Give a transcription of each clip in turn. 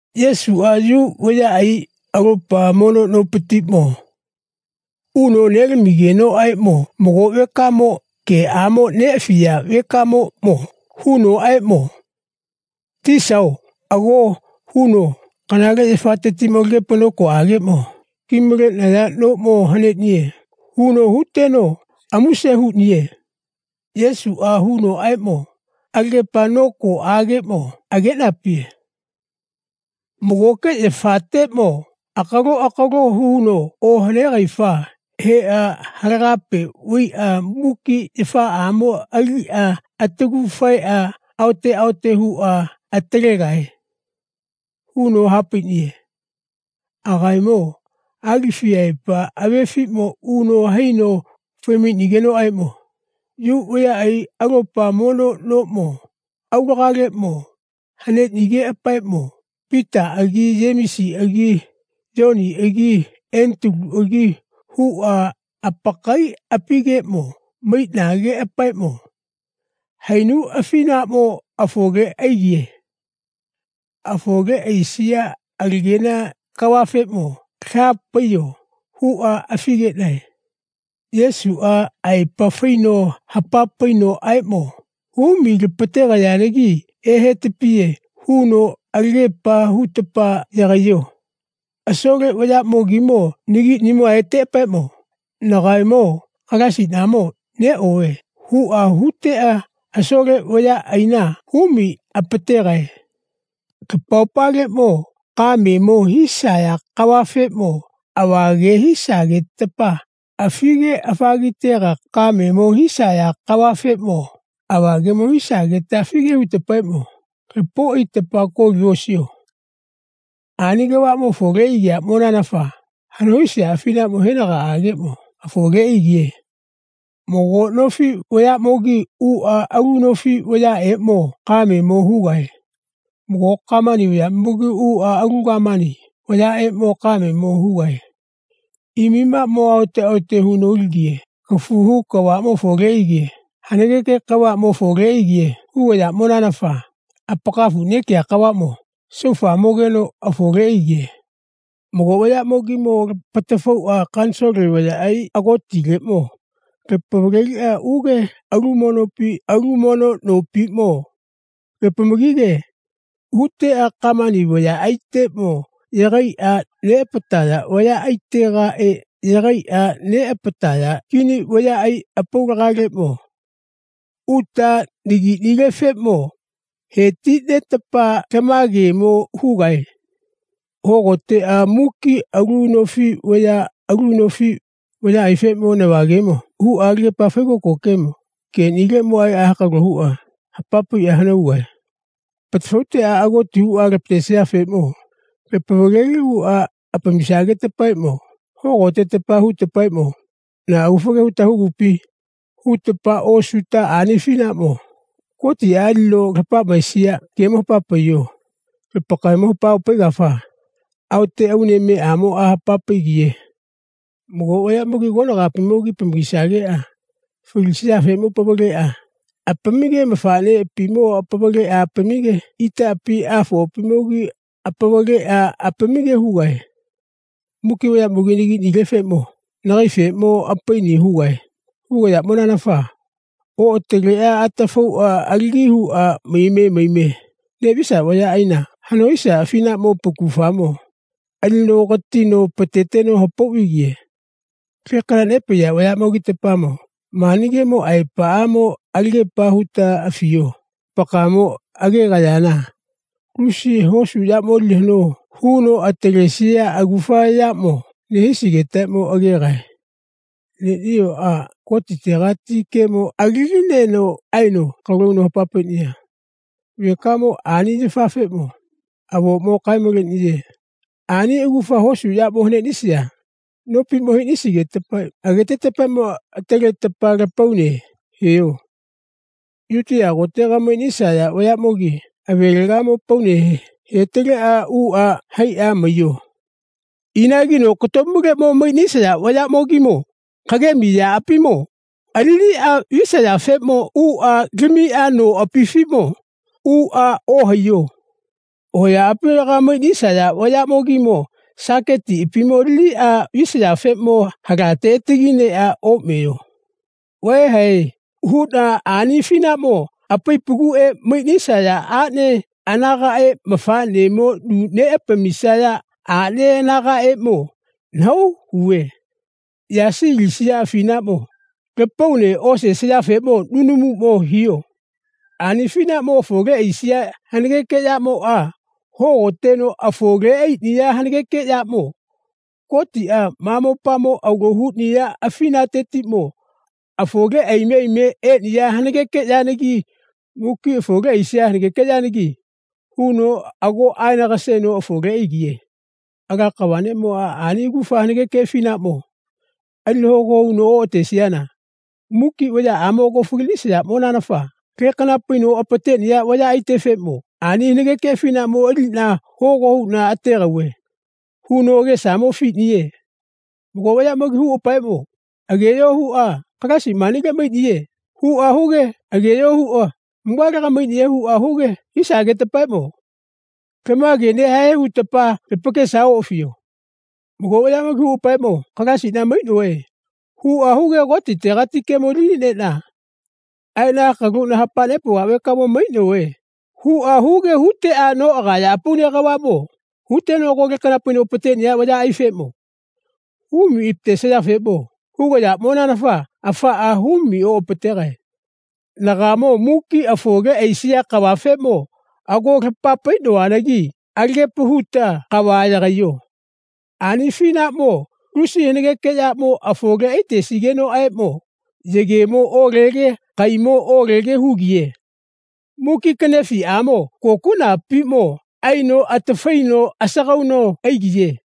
Yesuʼa Yu vayaʼai alopa mono nopatiʼmo uno nelamigenoʼaeʼmo mago vekamo geʼamo neʼafiya vekamoʼmo hunoʼaeʼmo, Tisao, ago, huno, kanale yafatetiʼmo alagepa nokoʼageʼmo ki maleʼnaya noʼmo haneʼniye, huno huteno amuse huʼniye. Yesuʼa hunoʼaeʼmo, alagepa nokoʼageʼmo ageʼnapiye. Magoke yafateʼmo akalo akalo huno ohanegaifa heʼa halagape vaiʼa muki yafaʼamo aiʼa atagu faeʼa aote aote huʼa atalegae, huno ha paiʼniye. Agaemo Alifiʼaepa avefiʼmo uno haino fai maiʼnigenoʼaeʼmo Yu vayaʼai alopa mono noʼmo aulagaleʼmo haneʼnigeʼapaeʼmo Pitaʼagi Yemisiʼagi Yoniʼagi Etaluʼagi huʼa apakaiʼapigeʼmo maiʼneʼapaeʼmo, hainu afinaʼmo afole aigiye. Afole aisiya alagena kavafeʼmo laha paiyo, huʼa afi geʼnae. Yesuʼa aepa faino hapa painoʼaeʼmo, humi lapategayanagi ehetapiye, huno, alagepa hutapa yagaiyo. Asole vayaʼmogimo nagiʼnimo aeteʼapaeʼmo, nagaemo Kalaisinaʼmo neʼove, huʼa huteʼa asole vayaʼaina humi apategae. Lapaopaleʼmo kamemo hisaya kavafeʼmo ava ge hisagetapa afige afagitega kamemo hisaya kavafeʼmo ava gemo hisagetapa afige hutetapaeʼmo lapau aitetapa koli osiyo. Ani kavaʼmo afole aigiyaʼmonanafa hano hisiya afinaʼmo henagaʼageʼmo afole aigiye. Sit 15:6Mago nofi vayaʼmogi uʼa alu nofi vayaʼeʼmo kamemo hugae. Mago gamani vayaʼmogi uʼa alu gamani vayaʼeʼmo kamemo hugae. Imimamo aote aote huno alige kafu hu kavaʼmo afole aige hanageke kavaʼmo afole aige hugiyaʼmonanafa apakafu nekiya kavaʼmo saufamogeno afole aigiye. Mago vayaʼmogimo lapatafauʼa kanisole vayaʼai agotileʼmo lapavaleliʼa uge alu mono nopi alu mono nopiʼmo lapamagige huteʼa gamani vayaʼaiteʼmo yagaiʼa neʼapataya vayaʼaitegaʼe yagaiʼa neʼapataya kini vayaʼai apaulagaleʼeʼmo uta nagiʼnilefeʼmo he ti netapa lama gemo hugae. Hogoteʼa muki alu nofi vaya alu nofi vayaʼaifeʼmo nava gemo huʼa alagepa faigoko geʼnimo aeʼa hakalo huʼa hapa paiʼa hano hugae. Lapatafauteʼa agoti huʼa lapatesayafeʼmo lapavaleliʼuʼa apamisagetapaeʼmo hogoteta hutapaeʼmo, na agufa ge huta hugupi, hutapa osuta ani afinaʼmo Gotiʼa alino lapamisiya gemo hapa paiyo. Lapakaemo hapa opaigafa Aote Aunemeʼamoʼa hapa paigiye. Mago vayaʼmogi konagaʼapimo apamagisageʼa falisayafeʼmo apavaleʼa apamige mafaʼneʼapimo apavaleʼa apamige itaʼapi afoʼapimogimo apavaleʼa apamige hugae. Muki vayaʼamogimo nagiʼnilefeʼmo lapakaefeʼmo apaini hugae. Hugayaʼmonanafa oʼataleʼa atafauʼa alagi huʼa maime maime neʼvisaya vayaʼaina hano hisiya afinaʼmo apakufamo alino katino apateteno hapau vaigiye. Lekana nepaiya vayaʼmogitapamo mani gemo aepaʼamo alagepa huta afiyo. Lapakaemo agegayana lusi hosu yaʼmoʼa alino hano huno atalesiya agufa yaʼmo haneʼnisigetapa agegae. Neniyoʼa Gotitegati gemo alinineno aeno hakalo huno hapa nepaiya vekamoʼmo ani yafeʼmo avoʼmo kae maleʼniye. Ani agufa hosu yaʼmo ohaneʼnisiya nopiʼmo haneʼnisigetapa agetetapaeʼmo ataleta lapaune heyo. Yutiya kotega maiʼnisaya vayaʼmogi avelegamo apaune hetaleʼa uʼa haiʼa maiyo. Inagi nokatomule maiʼnisaya vayaʼmogimo kagemi yaʼapimo aliniʼa visayafeʼmo uʼa lamiʼa noʼapifiʼmo uʼa ohaiyo. Hoyaʼapifilaga maiʼnisaya vayaʼmogi saketiʼapimo aliʼa vaisayafeʼmo halate atagi neʼa oʼmeyo. Vaehae, huʼna, ani afinaʼmo apaipa guʼe maiʼnisaya aʼne anagaʼe mafaʼnemo nu neʼapamisaya aʼne anagaʼeʼmo nahau huve. Yasi alisiya afinaʼmo lapaune osesayafeʼmo nunumuʼmo hiyo. Ani afinaʼmo afole aisiya hanageke yaʼmoʼa hogoteno afole aiʼniya hanageke yaʼmo Gotiʼa ma mopamo alo huʼniya afinatetiʼmo afole aime aime eʼniya hanageke yanagi muki afole aisiya hanageke yanagi huno ago aeno aga seno afole aigiye. Ala kava neʼmoʼa ani agufa hanageke afinaʼmo alino hogo huno oʼateʼniesinana muki vayaʼamo ago faliʼnaesinaʼmonanafa lekana paino apateʼniya vayaʼaitefeʼmo ani hanageke afinaʼmo aliʼna hogo huʼna ategauve, huno agesamo afiʼniye. Mago vayaʼmogimo huʼapaeʼmo, Ageyo, huʼa, Kalaisiʼa manile maiʼniye, huʼa huge, ageyo, huʼa, mugalega maiʼniye, huʼa huge hisagetapaeʼmo, lama gemo nehae, hutapa lapakesamo oʼafiyo. Mago vayaʼmogi huʼapaeʼmo, Kalaisiʼna maiʼnove, huʼa huge Gotitegati gemo aliniʼneʼna aeʼna hakalo huʼna hapa nepauva vekamo maiʼnove, huʼa huge huteʼa noʼagaya apaune kavaʼmo huteʼa ago lekana paino apateʼniya vayaʼaifeʼmo humi apatesayafeʼmo hugayaʼmonanafa afaʼa humi oʼapategae. Nagaemo muki afole aisiya kavafeʼmo ago lapa paiʼnovanagi alagepa huta kava yagaiyo. Ani afinaʼmo lusi hanageke yaʼmo afole aitesigenoʼaeʼmo yegemo olege kaimo olege hugiye. Muki kanefiʼamo kokuʼnapatiʼmo aino atafaino sagauno aigiye.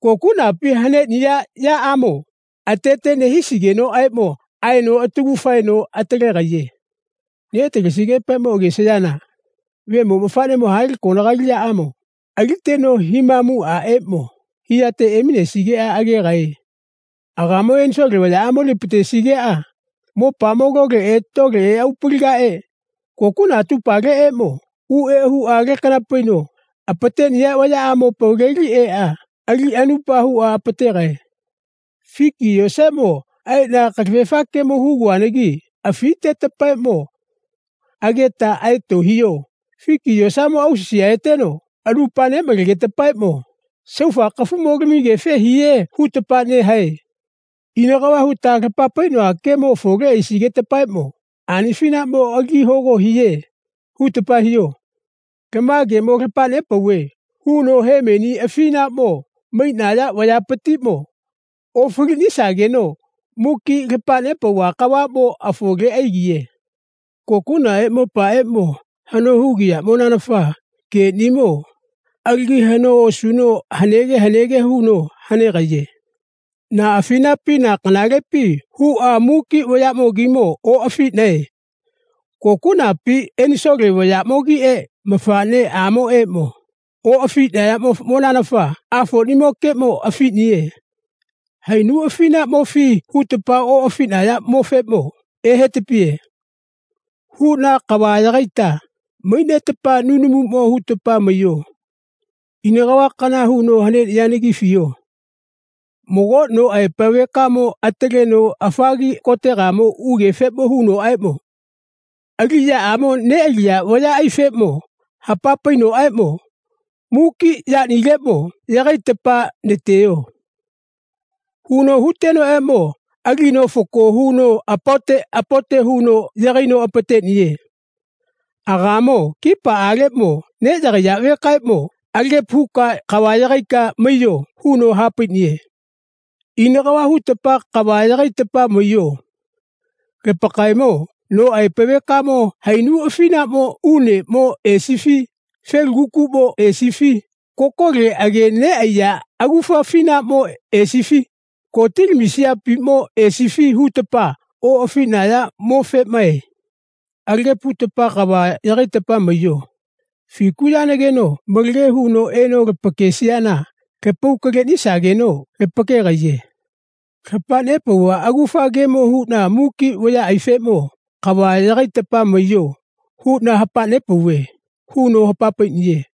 Kokuʼnapi haneʼniya yaʼamoʼmo atete nehisigenoʼaeʼmo aino atagu faeno atalegaiye. Neʼatalesigeʼapaeʼmo agesayana Vemo mafaʼnemoʼmo ha le konali yaʼamo aliteno himamuʼaʼeʼmo hiyateʼmo eminesigeʼa agegae. Agaemo enisole vayaʼamo alino apatesigeʼa ma mopamo loleʼe loleʼe atupaleʼe kokuʼna atupaleʼeʼmo uʼeʼa huʼa lekana paino apateʼniya vayaʼamo apavaleli eʼa aliʼa anupa huʼa apategae. Figi yosaeʼmo aeʼna kalafefa gemo huguvanagi afitetapaeʼmo ageta aeto hiyo. Figi yosamoʼa ausisi aeteno anupa neʼmalegetapaeʼmo saufa kafugamo lamigefe hiye, hutapa nehae. Ina kava hutapa lapa paiʼnova gemo afole aisigetapaeʼmo ani afinaʼmo alagi hogo hiye, hutapa hiyo. Lama gemo lapa nepauve, huno, hemeni afinaʼmo maiʼnaya vayapatiʼmo ofaliʼnisageno muki lapa nepauva kavaʼmo afole aigiye. Kokuʼnaʼe ma mopaʼeʼmo hano hugiyaʼmonanafa geʼnimo alagi hano osuno hanege hanege huno hanegaiye. Na afinapi na kanalepi huʼa muki vayaʼamogimo oʼafiʼnae. Kokuʼnapi enisole vayaʼmogiʼe Mafaʼneʼamoʼeʼmo oʼafiʼnayaʼmonanafa Afoʼamokeʼmo afiʼniye. Hainu afinaʼmofi hutapa oʼafiʼnayaʼmofeʼmo ehetapiye, huʼna, kava yagaita maiʼnetapa nunumuʼmo hutapa maiyo. Ina kavakana huno haneʼniyanagi afiyo. Mago no aepa vekamo ataleno afagi kotega ugefe hunoʼaeʼmo aliʼyaʼamo neʼaliya vayaʼaifeʼmo hapa painoʼaeʼmo, muki yaʼnileʼmo yagaitapa nateyo, huno huteno alino fako huno apaote apaote huno yagaino apateʼniye. Agaemo kipaʼaleʼmo neʼyagaiya vekaeʼmo alagepa huka kava yagaika maiyo, huno ha paiʼniye. Ina kava hutapa kava yagaitapa maiyo. Lapakaemo no aepa vekamo hainu afinaʼmo uneʼmo esifi felugakukuʼmo esifi kokole age neʼaiya agufa afinaʼmo esifi gotilamisiyapiʼmo esifi hutapa oʼafiʼnayaʼmofeʼmae. Alagepa hutapa kava yagaita maiyo, fiku yanageno malage huno eno lapakesiyana lapau kaleʼnisageno lapakegaiye. Lapa nepauva agufa gemo huʼna muki vayaʼaifeʼmo kava yagaita maiyo, huʼna hapa nepauve, huno hapa paiʼniye.